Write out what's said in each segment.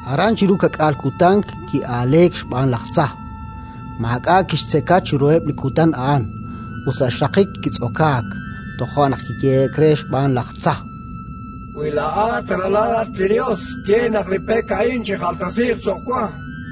Aran chiru ka'k'aal kutan ki'aaleek xb'aan laj tza. Maak'a' kixtzeka chiruheb' li kutan a'an, ut sa' xraqik kitz'okaak. Toja' naq kiyehe'k re xb'aan laj tza: —Wi laa'at Ralal li Yos, ye naq li pek a'in chijaltesiiq cho'q wa.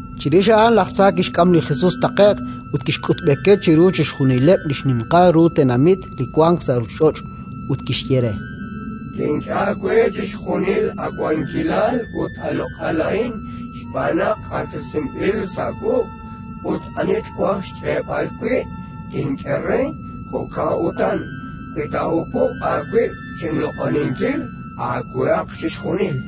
Chirix a'an laj tza kixk'am li Jesus taqe'q ut kixkutb'eke chiru chixjunileb' li xninqal ru tenamit li wank sa' ruuchich'och'; ut kixye re: —Tink'e aawe chixjunil a wankilal ut a loq'al a'in, xb'aan naq q'axtesinb'il sa' wuq' ut li ani twaj xk'eeb'al wi' tink'e re. Jo'kan utan, wi taahupub' aawib' chinloq'oninkil, aawehaq chixjunil.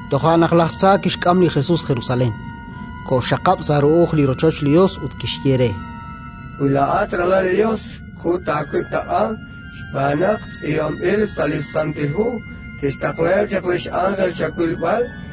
Toja' naq laj tza kixk'am li Jesus Jerusalén, koxxaqab' sa' ru'uj li rochoch li Yos ut kixye re: —Wi laa'at Ralal li Yos, kut aawib' taq'a, xb'aan naq tz'iib'anb'il sa' li Santil Hu: «Tixtaqlaheb' chaq li x'ánjel chawilb'al».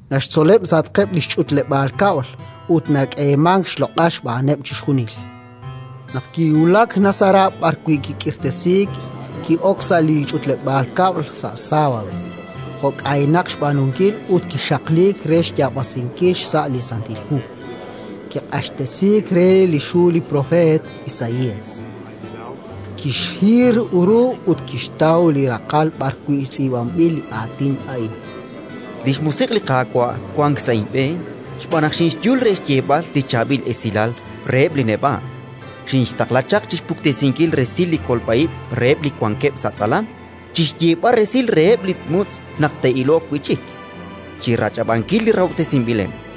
Naxtzoleb' sa'atqeb' li xch'utleb'aal kab'l ut nak'eemank xloq'al xb'aaneb' chixjunil. Naq kiwulak Nazará b'arwi' kik'iiresiik, ki'ok sa' li ch'utleb'aal kab'l sa' sábado, jo' k'aynaq xb'aanunkil, ut kixaqliik re xyaab'asinkil xsa' li Santil Hu. Kiq'axtesiik re li xhu li propeet Isaías. Kixhir ru ut kixtaw li raqal b'arwi' tz'iib'anb'il li aatin a'in: “Li xMusiq' li Qaawa' wank sa' inb'een xb'aan naq xinxyul re xyeeb'al li Chaab'il Esilal reheb' li neb'a'. Xinxtaqla chaq chi xpuktesinkil resil li kolb'a ib' reheb' li wankeb' sa' tz'alam, chi xyeeb'al resil reheb' li mutz' naq te'iloq wi' chik, chi rach'ab'ankil li rahob'tesinb'ileb'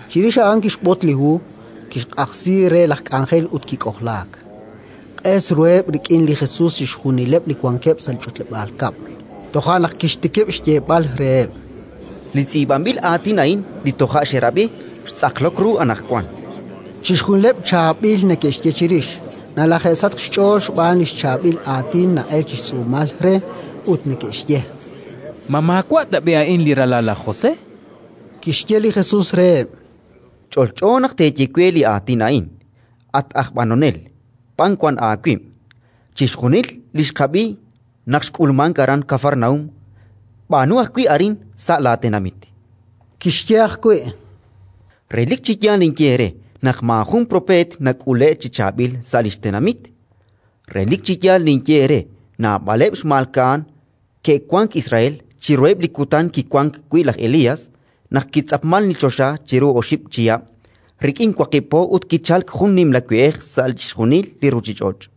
Chirix a'an kixbot li hu, kixq'ajsi re laj k'anjel ut kik'ojlaak. Q'es ruheb' rik'in li Jesus chixjunileb' li wankeb' sa' li ch'utleb'aal kab'l. Toja' naq kixtikib' xyeeb'al reheb': —Li tz'iib'anb'il aatin a'in li toja' xerab'i, xtz'aqlok ru anaqwan. Chixjunileb' chaab'il neke'xye chirix, nalaje'sachk xch'ool xb'aan li chaab'il aatin na'elk chi xtz'uumal re, ut neke'xye: —Ma maawa' tab'i' a'in li ralal laj José? Kixye li Jesus reheb': —Ch'olch'o naq teeye we li aatin a'in: «At aj b'anonel, b'an wan aawib'. Chixjunil li xqab'i naq xk'ulmank aran Kafarnaúm, b'aanu ajwi' arin sa' laatenamit». Kixye ajwi': —Relik chi yaal ninye eere naq maajun propeet nak'ule'k chi chaab'il sa' li xtenamit. Relik chi yaal ninye eere: naab'aleb' xmalka'an ke'wank Israel chiruheb' li kutan kiwank wi' laj Elías, naq kitz'apmank li choxa chiru oxib' chihab' rik'in waqib' po ut kichalk jun nimla we'ej sa' chixjunil li ruuchich'och';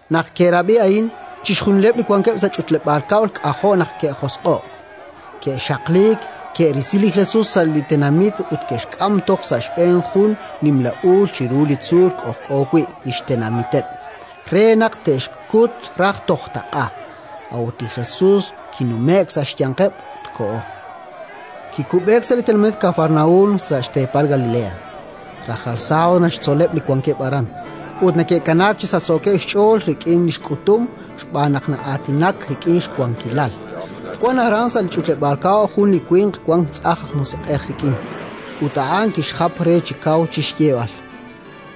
Naq ke'rab'i a'in, chixjunileb' li wankeb' sa' li ch'utleb'aal kab'l k'ajo' naq ke'josq'o'k. Ke'xaqliik, ke'risi li Jesus sa' li tenamit ut ke'xk'am toj sa' xb'een jun nimla uul chiru li tzuul k'ojk'o wi' li xtenamiteb', re naq te'xkut raj toj taq'a. A'ut li Jesus kinume'k sa' xyanqeb' ut koho. Kikub'eek sa' li tenamit Kafarnaúm, sa' xteepal Galilea. Rajlal sábado naxtzoleb' li wankeb' aran, ut neke'kanaak chi sachsookeb' xch'ool rik'in li xk'utum, xb'aan naq na'aatinak rik'in xwankilal. Wank aran, sa' li ch'utleb'aal kab'l, jun li winq wank tz'ajn aj musiq'ej rik'in; ut a'an kixjap re chi kaw chi xyeeb'al: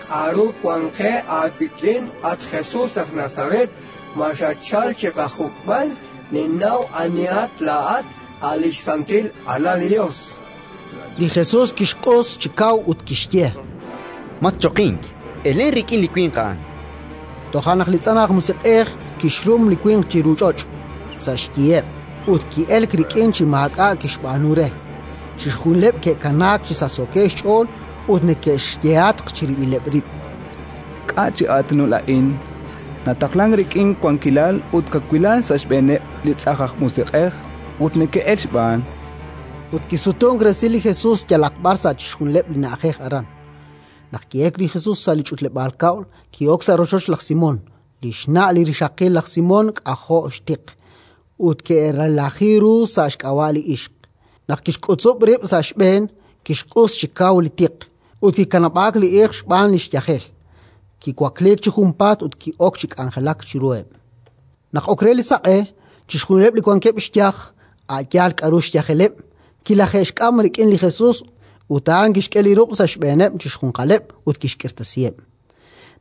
—K'aru wank qe aawik'in, at Jesus aj Nazaret? Ma xatchalk chi qajuk'b'al? Ninnaw anihat laa'at: a' li xSantil Alal li Yos, chan. Li Jesus kixq'us chi kaw ut kixye: —Matchoqink! Elen rik'in li winq a'an. Toja' naq li tz'ajn aj musiq'ej kixrum li winq chiru ch'och', sa' xyiheb', ut ki'elk rik'in chi maak'a' kixb'aanu re. Chixjunileb' ke'kanaak chi sachsookeb' xch'ool ut neke'xyehatq chirib'ileb' rib': —K'a' chi aatinul a'in? Nataqlank rik'in wankilal ut kawilal sa' xb'eeneb' li tz'ajn aj musiq'ej, ut neke'elk xb'aan. Ut kisutunk resil li Jesus yalaq b'ar sa' chixjunileb' li na'ajej aran. Naq ki'elk li Jesus sa' li ch'utleb'aal kab'l, ki'ok sa' rochoch laj Simón. Li xna' li rixaqil laj Simón k'ajo' xtiq; ut ke'relaji ru sa' xk'ab'a' li ixq. Naq kixk'utzub' rib' sa' xb'een, kixq'us chi kaw li tiq, ut kikanab'aak li ixq xb'aan li xyajel. Kiwakliik chi junpaat ut ki'ok chi k'anjelak chiruheb'. Naq ok re li saq'e, chixjunileb' li wankeb' xyaj, a' yaal k'aru xyajeleb', kilaje'xk'am rik'in li Jesus ut a'an kixk'e li ruq' sa' xb'eeneb' chixjunqaleb', ut kixk'irtasiheb'.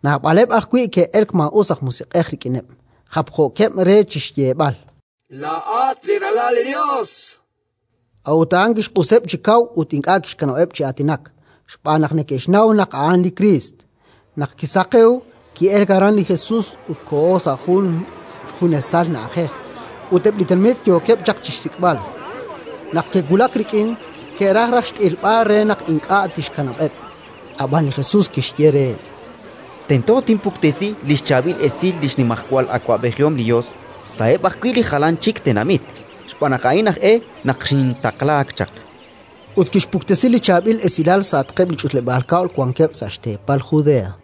Naab'aleb' ajwi' ke'elk maa'us aj musiq'ej rik'ineb', japjookeb' re chi xyeeb'al: —Laa'at li Ralal li Yos! A'ut a'an kixq'useb' chi kaw ut ink'a' kixkanab'eb' chi aatinak, xb'aan naq neke'xnaw naq a'an li Kriist. Naq kisaqewk, ki'elk aran li Jesus ut koho sa' jun junesal na'ajej; ut eb' li tenamit yookeb' chaq chi xsik'b'al. Naq ke'wulak rik'in, ke'raj raj xt'ilb'al re naq ink'a' tixkanab'eb'. Ab'an li Jesus kixye reheb': —Tento tinpuktesi li xChaab'il Esil li xnimajwal awab'ejihom li Yos sa'eb' ajwi' li jalan chik tenamit, xb'aan naq a'in aj e naq xintaqlaak chaq. Ut kixpuktesi li Chaab'il Esilal sa'atqeb' li ch'utleb'aal kab'l wankeb' sa' xteepal Judea.